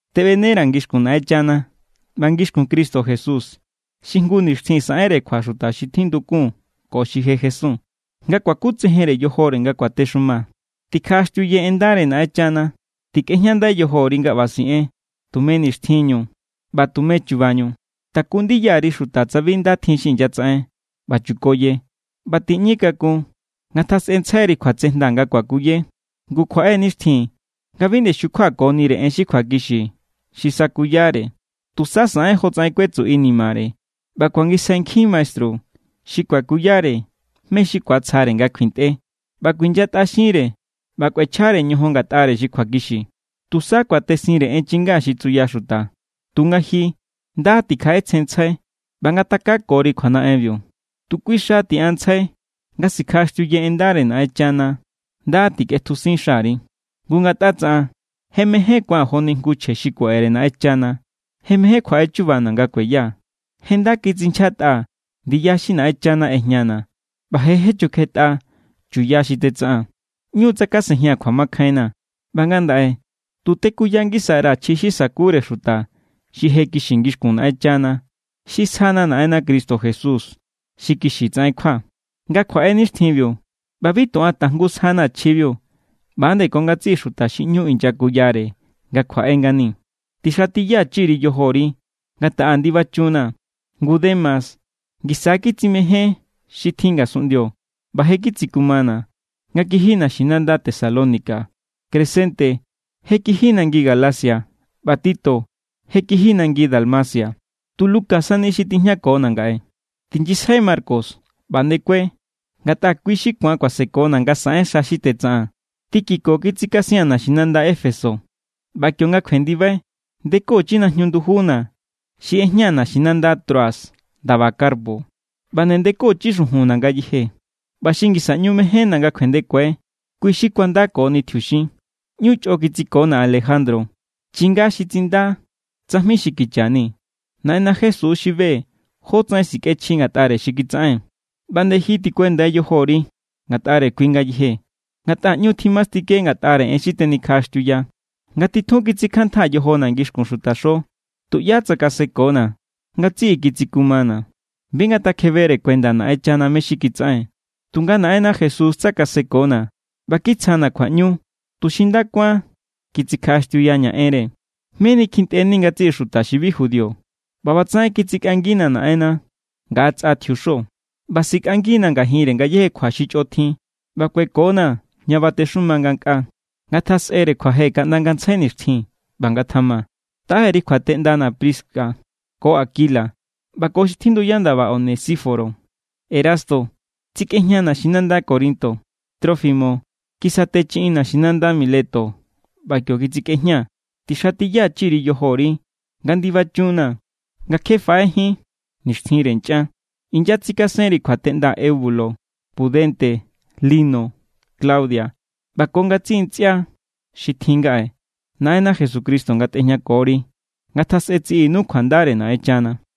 Teꞌbenera̱ ngixkun Naꞌenchana ꞌba ngixkun Cristo Jesús, xi jngu nixtjin saꞌenre kjua xuta xi tjindukun ko xi je jesun, nga kuakutsejen yojore nga kuatexuma. Tikjaꞌaxtiuye en ndare Naꞌenchana. Tikꞌejñandai yojori nga ꞌba siꞌen tume nixtjinñu ꞌba tume chubañu. Taku ndiya_ri xuta tsa bi nda tjin xi inyatsaꞌen, ꞌba chukoye, ꞌba tiꞌñi kakun. Ngatjasꞌentsjairi kjuatsejnda nga kuakuye. Ngu kjuaꞌe= nixtjin nga bi nde xukjuakonire xuta en xi kjuakixi xi sakuyare. Tusa saꞌen jotsaꞌen kuetsu inimare ꞌba kuangisjai nkjin maestru xi kuakuyare mé= xi ku̱atsjare nga kjuintꞌe. ꞌBa kuinyatꞌaxinre ꞌba kꞌuechjare ñojon ngatꞌare xi kjuakixiu. Tusa kuatesinre en chinga xi tsuya xuta. Tunga ji, nda tikjaꞌetsjenntsjai ꞌba ngatakakori kjuanaꞌenbiu. Tu kui xa tiꞌanntsjai nga sikjaꞌaxtiuye en ndare Naꞌenchana. Nda tikꞌetjusin xari. Ngu ngatꞌa tsaꞌan, je mején ku̱an joni jngu chje xi kuaꞌere Naꞌenchana. Je mején kjuaꞌe chuba nga kueya. Je nda kitsinchjatꞌaa̱ ndiya xi Naꞌenchana ꞌejñana̱ ꞌba je jechukjetꞌa chuya xi tetsaꞌaa̱n. ꞌÑu= tsakasejia̱n kjuamakjainna. ꞌBa ngandaꞌe tu tekuya ngisa_ra̱ chji xi sa̱kure xuta xi je kixi ngixkun Naꞌenchana. Xi sjana̱ Naꞌenna Cristo Jesús xi kixi tsaꞌen kjua, nga kjuaꞌe nixtjinbiu. ꞌBa bi tu an tajngu sjana̱ chjibiu, ꞌba=nde ko ngatsiꞌi xuta xi ꞌñu inyakuyare nga kjuaꞌe ngani. Tixatiyachi_ri yojori nga taꞌa ndibachunnaa̱. Ngu Demas ngisa kitsimején xi tjin ngasunꞌndio ꞌba je kitsikumana̱ nga kiji naxinanda Tesalónica. Crescente je kiji nangi Galacia, ꞌba Tito je kiji nangi Dalmacia. Tu Lucas sani tijñakona̱ ngaꞌe. Tinyisjai Marcos ꞌba ndekue, ngatꞌa kui xi ku̱an kuasekona̱ nga saꞌen xa xi tetsaꞌaa̱n. Tíquico kitsikasia̱n naxinanda Éfeso. ꞌBa kionga kjuendibai, ndekochi najñu ndujuna̱ xi ꞌejñaa̱ naxinanda Troas, ndaba Carpo. ꞌBa nde ndekochi xujunna̱ ngayeje, ꞌba xi ngisa ꞌñu mejénna̱ nga kjuendekue kui xi kuandakoni tjiuxin. ꞌÑu chꞌo kitsikona̱ Alejandro, chinga xi tsinda tsajmi xi kicha ni. Naꞌenna Jesús xi be= jótsaꞌen sikꞌechji ngatꞌare xi kitsaꞌen. ꞌBa nde ji tikuendai yojori ngatꞌare kui ngayeje, ngatꞌa ꞌñu= tjimastike ngatꞌare en xi tenikjaꞌaxtiuya. Nga titjun kitsikjantjaa̱ yojona̱ ngixkun xuta xo, tuꞌyá tsakasekona̱. Ngatsiꞌi kitsikumana̱. Bi ngatakjebere kuenda Naꞌenchana mé= xi kitsaꞌen. Tunga Naꞌenna Jesús tsakaseko=na̱ ꞌba kitsjana̱ kjuaꞌñu, tuxi nda kuán kitsikjaꞌaxtiuyaña̱ enre. Meni kjintꞌeni ngatsiꞌi xuta xi bi judío. ꞌBa ꞌbatsaꞌen kitsikꞌangina̱ Naꞌenna ngaꞌa tsꞌa tjiuxo. ꞌBa sikꞌangina̱ ngajinre ngayéje kjua xi chꞌo tjin ꞌba kueko=na̱ ña batexuma ngankꞌaa. ¡Ngatjasꞌere kjuaje kaꞌnda ngantsjai nixtjin! ꞌBa ngatjama. Taꞌe_ri kjuateꞌndana̱ Prisca ko Aquila ꞌba ko xi tjinduya ndaba Onesíforo. Erasto tsikꞌejña naxinanda Corinto. Trófimo kisatechiꞌin naxinanda Mileto ꞌba kio kitsikꞌejñaa̱. Tixatiyachi_ri yojori nga ndibachunnaa̱ nga kje baꞌejín nixtjinre nchꞌan. Inyatsikasenri kjuateꞌnda Eubulo, Pudente, Lino, Claudia ꞌba ko ngatsiꞌi ntsꞌia xi tjin ngaꞌe. Naꞌenna Jesucristo ngatꞌejñakori. Ngatjasꞌe tsiꞌinu kjuandare Naꞌenchana.